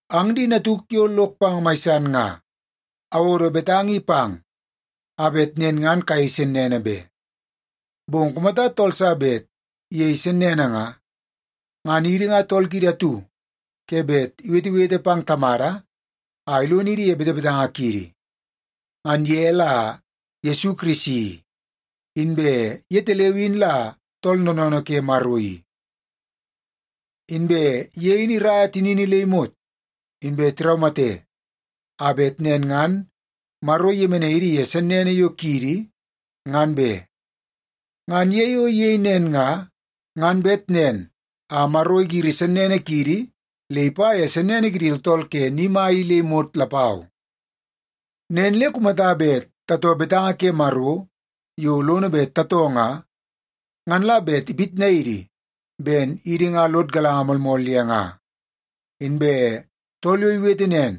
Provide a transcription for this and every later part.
Ang di natuk yo lok pang mai san nga, awodo betanga i pang, a bet nen ngan kayei sennene be. Bong kumata tool sa bet iyei sennene nga, ngan idi nga tool kiidi atu ke bet iwetewete pang Tamada a ilonidi ye betebetanga kiidi. Ngan ye la Yesu Kirisi i, inbe yetaleu in la Tool Noonoonoo ke Maro i. Inbe ye in iraia tinini le imot inbe tiraumate a bet nen ngan Maro iyemenai idi ye sennene yo kiidi, ngan be. Ngan ye yo iyei nen nga, ngan bet nen a Maro igiri sennene kiidi le ipa ye sennene kidi tooltool ke ni mai i le imot lapau. Nen le kumata bet tatoo betanga ke Maro yo lono bet tatoo nga, ngan la bet ipitnai idi ben idi nga lod galanga moolmool ye nga. Inbe tool yo iwete nen,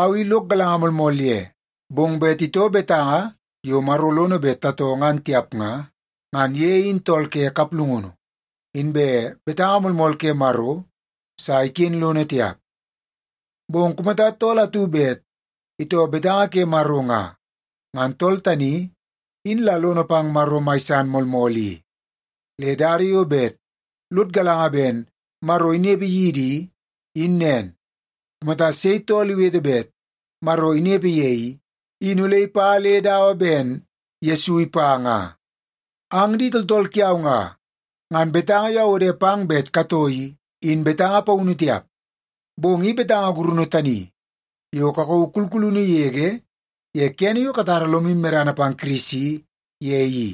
“Au i lok galanga moolmool ye,” bong bet itoo betanga yo Maro lono bet tatoo ngan tiap nga, ngan ye in tool ke kaplungunu, inbe betanga moolmool ke Maro sa iken lono tiap. Bong kumata tool atu bet itoo betanga ke Maro nga, ngan tool tani in la lono pang Maro mai san moolmool i. Le dada yo bet lod galanga ben Maro inepe yidi i, in nen: Kumata sei tool iwete bet Maro inepe ye i, in ole ipa le dawa ben Yesu ipa nga. Ang di tooltool kiau nga, ngan betanga yo awode pang bet katoo i, in betanga paunu tiap. Bong i betanga gurunu tani yo kakauu kulkulunu yege ye kene yo katara lomu medana pang Kirisi ye i.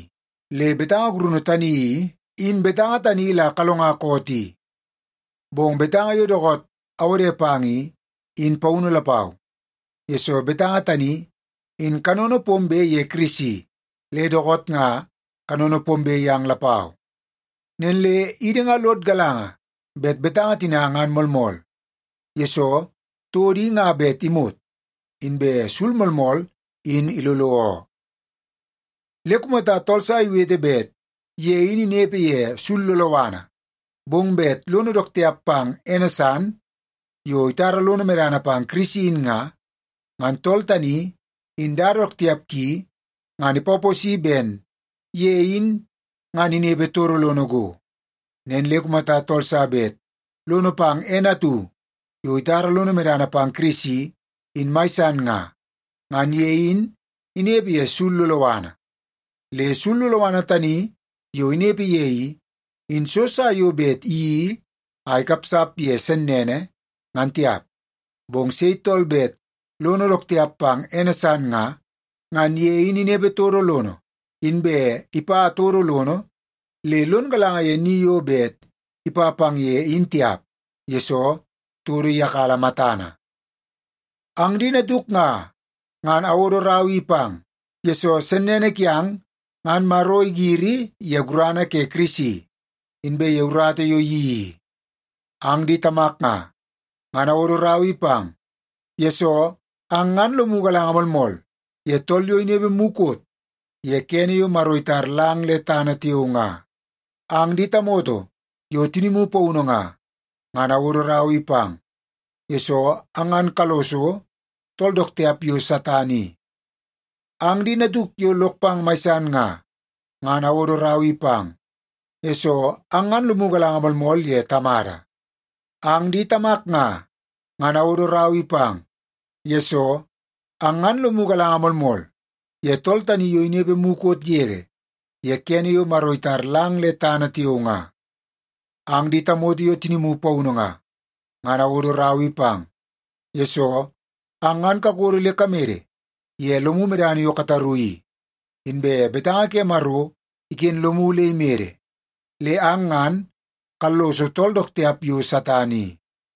Le betanga gurunu tani i, in betanga tani la kalonga koot i. Bong betanga yo dookoot awode pang i, in paunu lapau, yesoo betanga tani in kanono pombe ye Kirisi le dookoot nga kanono pombe yang lapau. Nen le idi nga lod galanga bet betanga tina ngan moolmool, yesoo todo i nga bet imot, inbe sul moolmool in ilolo oo. Le kumata tool sa iwete bet ye in inepe ye sul loloana, bong bet lono dook tiap pang ene san yo itara lono medana pang Kirisi in nga, ngan tool tani in dada dook tiap ki ngan ipaposi ben ye in ngan inepe todo lono go. Nen le kumata tool sa bet lono pang ene atu yo itara lono medana pang Kirisi in mai san nga, ngan ye in inepe ye sul loloana. Le sul loloana tani yo inepe ye i, in so sa yo bet iyeii a ikapsap ye sennene, ngan tiap. Bong sei tool bet lono dook tiap pang ene san nga, ngan ye in inepe todo lono, inbe ipa todo lono le lon galanga ye ni yo bet ipa pang ye in tiap, yesoo todo iyakala matana. Ang di natuk nga, ngan awodo rau i pang, yesoo sennene kiang ngan Maro igiri ye gurana ke Kirisi, inbe ye urata yo iyeii i. Ang di tamak nga, ngan awodo rau i pang, yesoo ang ngan lomu galanga moolmool ye tool yo inepe mukot ye kene yo Maro itar lang le tana tiao nga. Ang di tamoto yo tinimu paunu nga, ngan awodo rau i pang, yesoo ang ngan kalloso tool dook tiap yo Satan i. Ang di natuk yo lok pang mai san nga, ngan awodo rau i pang, yesoo ang ngan lomu galanga moolmool ye Tamada. Ang di tamak nga, ngan awodo rau i pang, yesoo ang ngan lomu galanga moolmool ye tool tani yo inepe mukot yege ye kene yo Maro itar lang le tana tiao nga. Ang di tamoto yo tinimu paunu nga, ngan awodo rau i pang, yesoo ang ngan kakodo le kamede ye lomu medana yo kataru i, inbe betanga ke Maro iken lomu le imede le ang ngan kalloso tool dook tiap yo Satan i.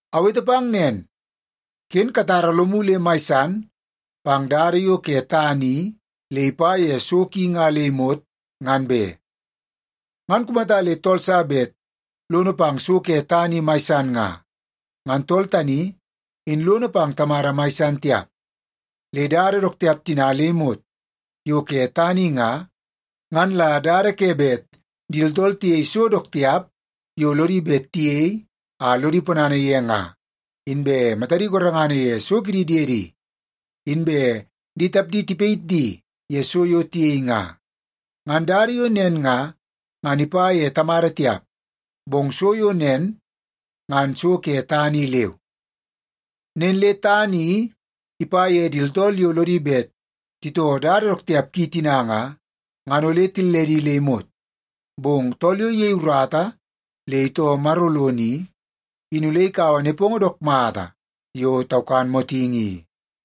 Awete pang nen, ken katara lomu le mai san pang dada yo ke tana i le ipa ye so ki nga le imot ngan be. Ngan kumata le tool sa bet lono pang so ke tana i mai san nga, ngan tool tani in lono pang Tamada mai san tiap. Le dada dook tiap tina le imot yo ke tana i nga, ngan la dada ke bet di tooltool tiyei so dook tiap yo lodi bet tiyei a lodi ponana ye nga, inbe matadi gorengana ye so kidi diedi, inbe di tapdi tipayit di ye so yo tiyei nga. Ngan dada yo nen nga, ngan ipa ye Tamada tiap, bong so yo nen ngan so ke tana i leu. Nen le tana i ipa ye di tooltool yo lodi bet titoo dada dook tiap ki tina nga, ngan ole tilledi le imot. Bong tool yo iyei urata le itoo Maro lono i, in ole ikaua nepongo dook mata yo taukan motingi i.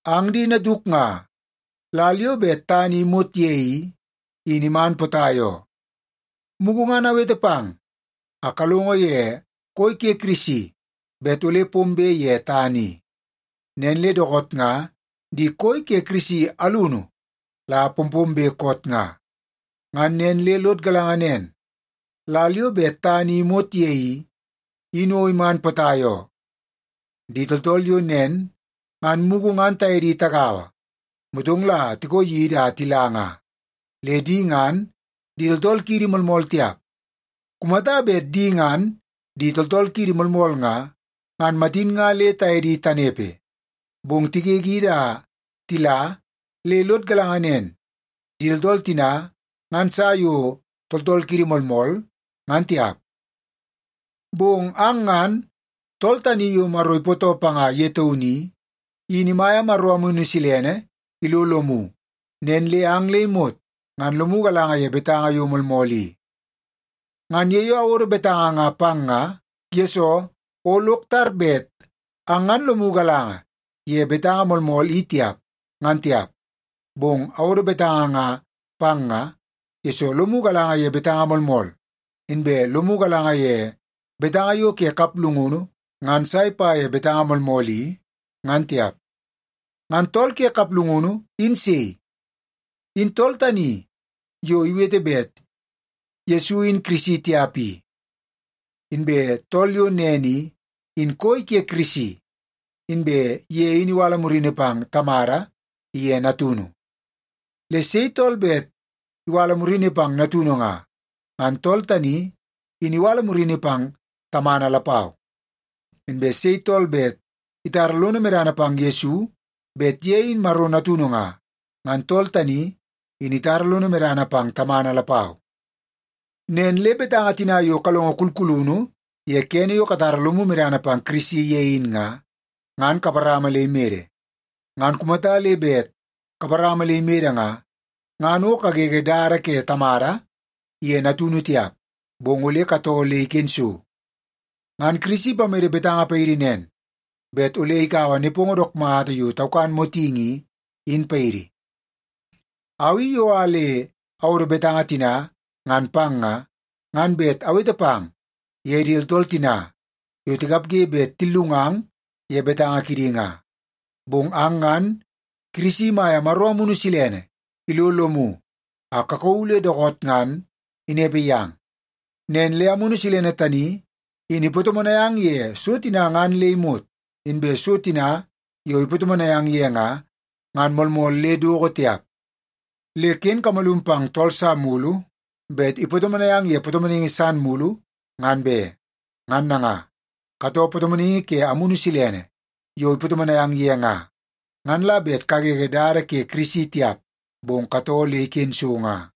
Ang di natuk nga, lal yo bet tana i imot ye i, in iman potai oo. Mugu ngan amwete pang a kalongo ye koi ke Kirisi bet ole pombe ye tana i. Nen le dookoot nga di koi ke Kirisi alunu la pompombe koot nga. Ngan nen le lod galanga nen, lal yo bet tana i imot ye i, in o iman potai oo. Di tooltool yo nen ngan mugu ngan taye di tagaua, motong la tikoo yidi a tila nga. Le di ngan di tooltool kiidi moolmool tiap. Kumata bet di ngan di tooltool kiidi moolmool nga, ngan matin nga le taye di tanepe. Bong tigegidi a tila le lod galanga nen, di tooltool tina ngan sa yo tooltool kiidi moolmool ngan tiap. Bong ang ngan, Tool Tani Yo Maro Ipootoo Panga Ye Taunu I, in imaia Maro Amunu Silene ilo lomu nen le ang le imot ngan lomu galanga ye betanga yo moolmool i. Ngan ye yo awodo betanga nga pang nga, yesoo o lok tar bet ang ngan lomu galanga ye betanga moolmool i tiap, ngan tiap. Bong awodo betanga nga pang nga, yesoo lomu galanga ye betanga moolmool, inbe lomu galanga ye betanga yo ke kaplungunu ngan sa ipa ye betanga moolmool i, ngan tiap. Ngan tool ke kaplungunu in sei? In tool tani yo iwete bet Yesu in Kirisi tiap i. Inbe tool yo nen i, in koi ke Kirisi inbe ye in iwala murini pang Tamada iye Natunu. Le sei tool bet iwala murini pang Natunu nga, ngan tool tani in iwala murini pang Tamana lapau. Inbe sei tool bet itara lono medana pang Yesu bet ye in Maro Natunu nga, ngan tool tani in itara lono medana pang Tamana lapau. Nen le betanga tina yo kalongo kulkulunu ye kene yo katara lomu medana pang Kirisi ye in nga, ngan kaparama le imede. Ngan kumata le bet kaparama le imede nga, ngan o kagege dada ke Tamada iye Natunu tiap, bong ole katoo le iken so. Ngan Kirisi ipamede betanga paidi nen, bet ole ikaua nepongo dook mata yo taukan motingi i, in paidi. Au i yo a le awodo betanga tina ngan pang nga, ngan bet awete pang ye di tooltool tina yo tikapge bet tillungang ye betanga kidi nga. Bong ang ngan Kirisi imaia Maro Amunu Silene ilo lomu a kakauu le dookoot ngan inepe yang. Nen le Amunu Silene tani in ipatomonai ang ye so tina ngan le imot, inbe so tina yo ipatomonai ang ye nga, ngan moolmool le doko tiap. Le ken kamalum pang tool sa mulu bet ipatomonai ang ye patomonaingi san mulu, ngan be. Ngan nanga, katoo patomonaingi ke Amunu Silene yo ipatomonai ang ye nga, ngan la bet kagege dada ke Kirisi tiap, bong katoo le iken so nga.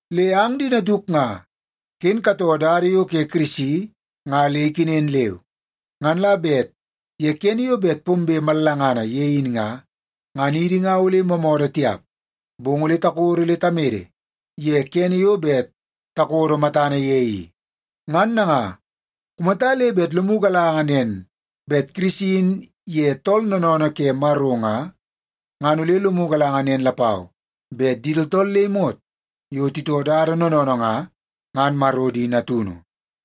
Le ang di natuk nga, ken katoo dada yo ke Kirisi nga le ikenen leu. Ngan la bet ye kene yo bet pombe mallangana ye in nga, ngan idi nga ole moomoodoo tiap, bong ole takodo le tamede ye kene yo bet takodo matana ye i. Ngan nanga, kumata le bet lomu galanga nen bet Kirisi in ye tool noonoonoo ke Maro nga, ngan ole lomu galanga nen lapau, bet di tooltool le imot yo titoo dada noonoonoo nga, ngan Maro di natunu.